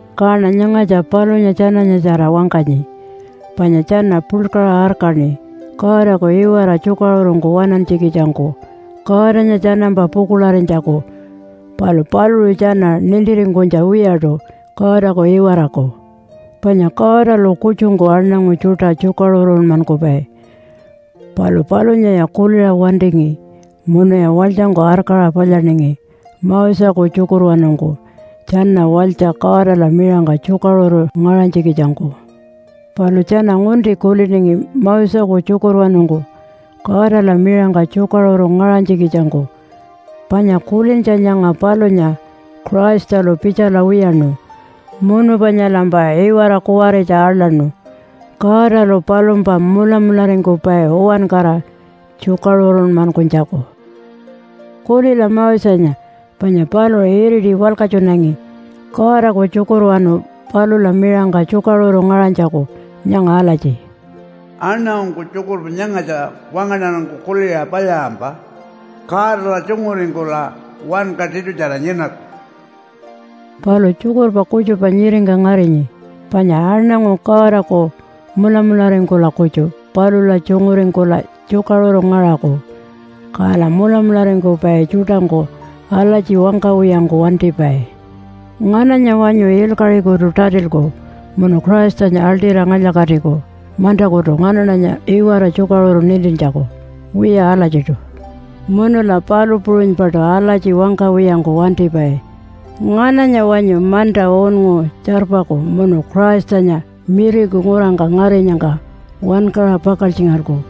Kaṉa nyangatja palunya tjananyatjara wangkanyi, panya tjana puḻkaṟa arkaṉi Godaku iwara tjukaṟurungku waṉantjikitjangku, Godanya tjanampa pukuḻarinytjaku. Palu paluṟu tjana nintiringkunytja wiyaṯu Godaku iwaraku. Panya Godalu kutjungku aṉangu tjuṯa tjukaṟurunmankupai. Palu palunyaya kuliṟa wantingi munuya walytjangku arkaṟa palyaningi Moseku tjukurwanungku tjana walytja Godala miṟangka tjukaṟuru ngaṟanytjikitjangku. Palu tjana ngunti kuliningi Moseku tjukurwanungku Godala miṟangka tjukaṟuru ngaṟanytjikitjangku. Panya kulintja nyanga palunya Christalu pitjala wiyaṉu, munu panyalampa iwara kuwaritja aḻaṉu Godalu palumpa mulamularingkupai uwankara tjukaṟurunmankunytjaku. Kulila Mosenya, panya paluṟu iriti walkatjunangi Godaku tjukurwanu palula miṟangka tjukaṟuru ngaṟanytjaku nyanga alatji, “Aṉangungku tjukurpa nyangatja wangaṉarangku kuliṟa palyaṟampa Godala tjunguringkula wanka tiṯutjara nyinaku.” Palu tjukurpa kutjupa nyiringka ngarinyi panya aṉangu Godaku mulamularingkula kutju palula tjunguringkula tjukaṟuru ngaṟaku. Kala mulamularingkupai tjuṯangku alatji wangkawiyangku wantipai, “Ngananya wanyu ilkaṟikutu tatilku munu Christanya aḻṯira ngalya-katiku mantakutu nganaṉanya iwara tjukaṟuru nintintjaku?” Wiya alatjiṯu. Munula palu puṟunypaṯu alatji wangkawiyangku wantipai, “Ngananya wanyu manta unngu tjarpaku munu Christanya miriku ngurangka ngarinyangka wankaṟa pakaltjingalku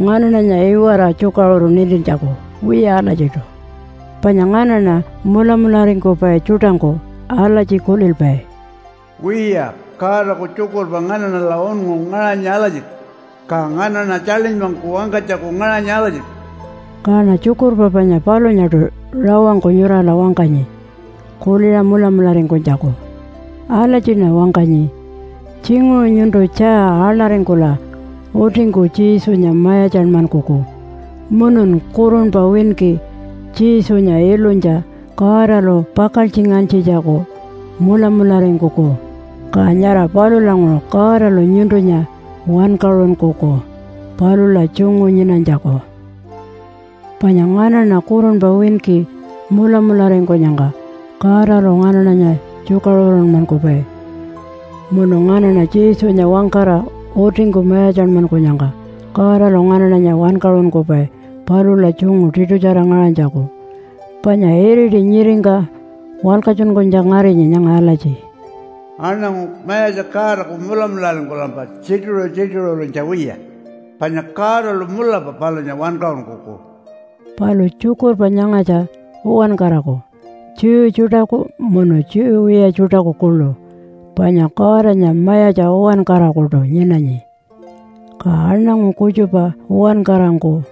nganaṉanya iwara tjukaṟuru nintintjaku?” Wiya alatjiṯu. Panya nganaṉa mulamularingkupai tjuṯangku alatji kulilpai, “Wiya, Godaku tjukurpa nganaṉala unngu ngaṟanyi alatjiṯu, ka nganaṉa tjaḻinypangku wangkanytjaku ngaṟanyi alatjiṯu.” Kaṉa tjukurpa panya palunyaṯu rawangku nyurala wangkanyi kuliṟa mulamularingkunytjaku. Alatjiṉa wangkanyi, “Tjinguṟu nyuntu tjaa aḻaringkula utingku Jesunya mayatjanmankuku munun kurunpa winki Jesunya ilunytja Godalu pakaltjingantjitjaku mulamularingkuku, ka nyara palulanguṟu Godalu nyuntunya wankaṟunkuku palula tjungu nyinanytjaku.” Panya nganaṉa kurunpa winki mulamularingkunyangka Godalu nganaṉanya tjukaṟurunmankupai. Munu nganaṉa Jesunya wangkara utingku mayatjanmankunyangka Godalu nganaṉanya wankaṟunkupai palula tjungu tiṯutjara ngaṟanytjaku. Panya iriti nyiringka walkatjunkunytja ngarinyi nyanga alatji, “Aṉangu Mayatja Godaku mulamularingkulampa tjituṟu-tjituṟurinytja wiya, panya Godalu mulapa palunya wankaṟunkuku.” Palu tjukurpa nyangatja uwankaraku Jew tjuṯaku munu Jew wiya tjuṯaku kuḻu. Panya Godanya mayatja uwankarakuṯu nyinanyi, ka aṉangu kutjupa uwankarangku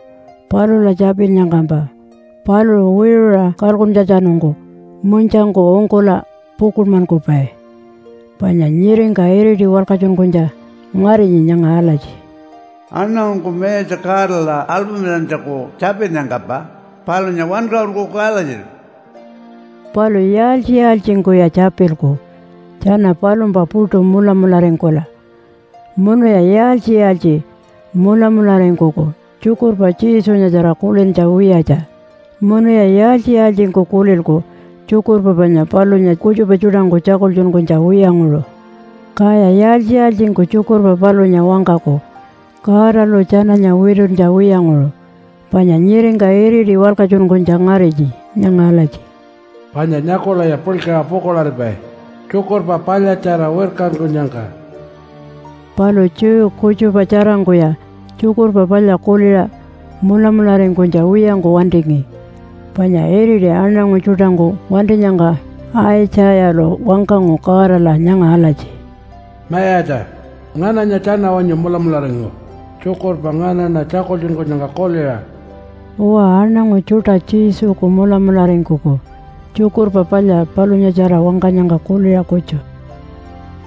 palula tjapinnyangkampa paluṟu wiṟuṟa kalkuntjatjanungku munytjangku ungkula pukuḻmankupai. Panya nyiringka iriti walkatjunkunytja ngarinyi nyanga alatji, “Aṉangungku Mayatja Godala alpamilantjaku tjapinnyangkampa palunya wankaṟunkuku alatjiṯu.” Palu yaaltji-yaaltjingkuya tjapilku tjana palumpa puṯu mulamularingkula? Munuya yaaltji-yaaltji mulamularingkuku tjukurpa Jesunyatjara kulintja wiyatja? Munuya yaaltji-yaaltjingku kulilku tjukurpa panya palunya kutjupa tjuṯangku tjakultjunkunytja wiyanguṟu? Kaya yaaltji-yaaltjingku tjukurpa palunya wangkaku Godalu tjananya wituntja wiyanguṟu? Panya nyiringka iriti walkatjunkunytja ngarinyi nyanga alatji, “Panya nyakulaya puḻkaṟa pukuḻaripai tjukurpa palyatjara wirkankunyangka.” Palu Jew kutjupa tjarangkuya Tjukurpa Palya kuliṟa mulamularingkunytja wiyangku wantingi. Panya iriti aṉangu tjuṯangku wantinyangka Aitjayalu wangkangu Godala nyanga alatji, “Mayatja, ngananya tjana wanyu mulamularingu tjukurpa nganaṉa tjakultjunkunyangka kuliṟa?” Uwa, aṉangu tjuṯa Jesuku mulamularingkuku Tjukurpa Palya palunyatjara wangkanyangka kuliṟa kutju.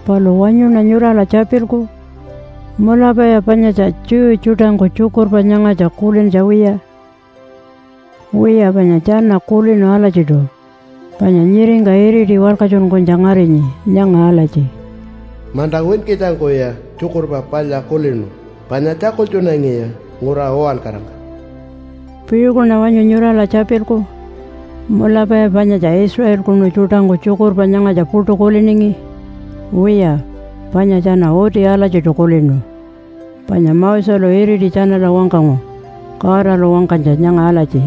Palu wanyuṉa nyurala tjapilku, “Mulapaya panyatja Jew tjuṯangku tjukurpa nyangatja kulintja wiya?” Wiya panya tjana kulinu alatjiṯu. Panya nyiringka iriti walkatjunkunytja ngarinyi nyanga alatji, “Manta winkitjangkuya tjukurpa palya kulinu panya tjakultjunangiya ngura uwankarangka.” Piṟukuṉa wanyu nyurala tjapilku? Mulapaya panyatja Israelkunu tjuṯangku tjukurpa nyangatja puṯu kuliningi? Wiya, panya tjana uti alatjiṯu kulinu, panya Moselu iriti tjanala wangkangu Godalu wangkanytja nyanga alatji,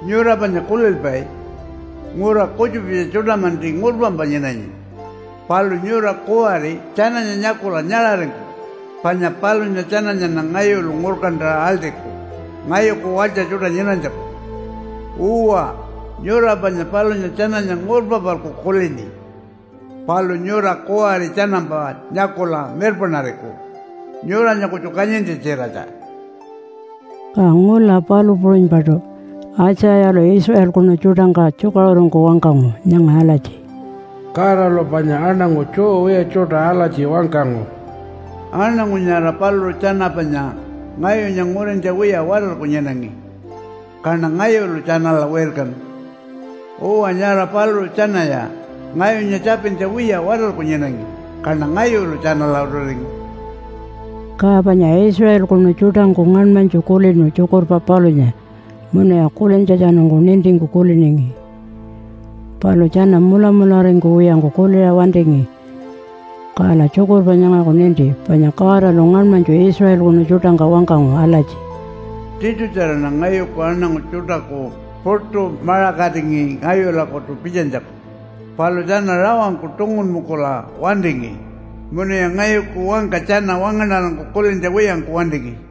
“Nyura panya kulilpai ngura kutjupitja tjuṯa-manti ngurpampa nyinanyi. Palu nyura kuwari tjananya nyakula nyaṟaringkuku panya palunya tjananyaṉa ngayulu ngurkantaṟa aḻṯiku ngayuku walytja tjuṯa nyinanytjaku. Uwa, nyura panya palunya tjananya ngurpa-palku kulini. Palu nyura kuwari tjanampa nyakula mirpaṉariku nyuranya kutju kanyintja-tjiratja.” Ka ngula palu puṟunypaṯu Aitjayalu Israelkunu tjuṯangka tjukaṟurungku wangkangu nyanga alatji, “Godalu panya aṉangu Jew wiya tjuṯa alatji wangkangu, ‘Aṉangu nyara paluṟu tjana panya ngayunya ngurintja wiya watarku nyinangi, kaṉa ngayulu tjanala wirkanu. Uwa nyara paluṟu tjanaya ngayunya tjapintja wiya watarku nyinangi, kaṉa ngayulu tjanala utiringu.’” Ka panya Israelkunu tjuṯangku ngaṉmanytju kulinu tjukurpa palunya munuya kulintjatjanungku nintingku kuliningi. Palu tjana mulamularingkuwiyangku kuliṟa wantingi. Kala tjukurpa nyangaku ninti panya Godalu ngaṉmanytju Israelkunu tjuṯangka wangkangu alatji, “Tiṯutjaraṉa ngayuku aṉangu tjuṯaku puṯu maṟakatingi ngayulakutu pitjanytjaku. Palu tjana rawangku tungunpungkula wantingi, munuya ngayuku wangka tjana wangaṉarangku kulintja wiyangku wantingi.”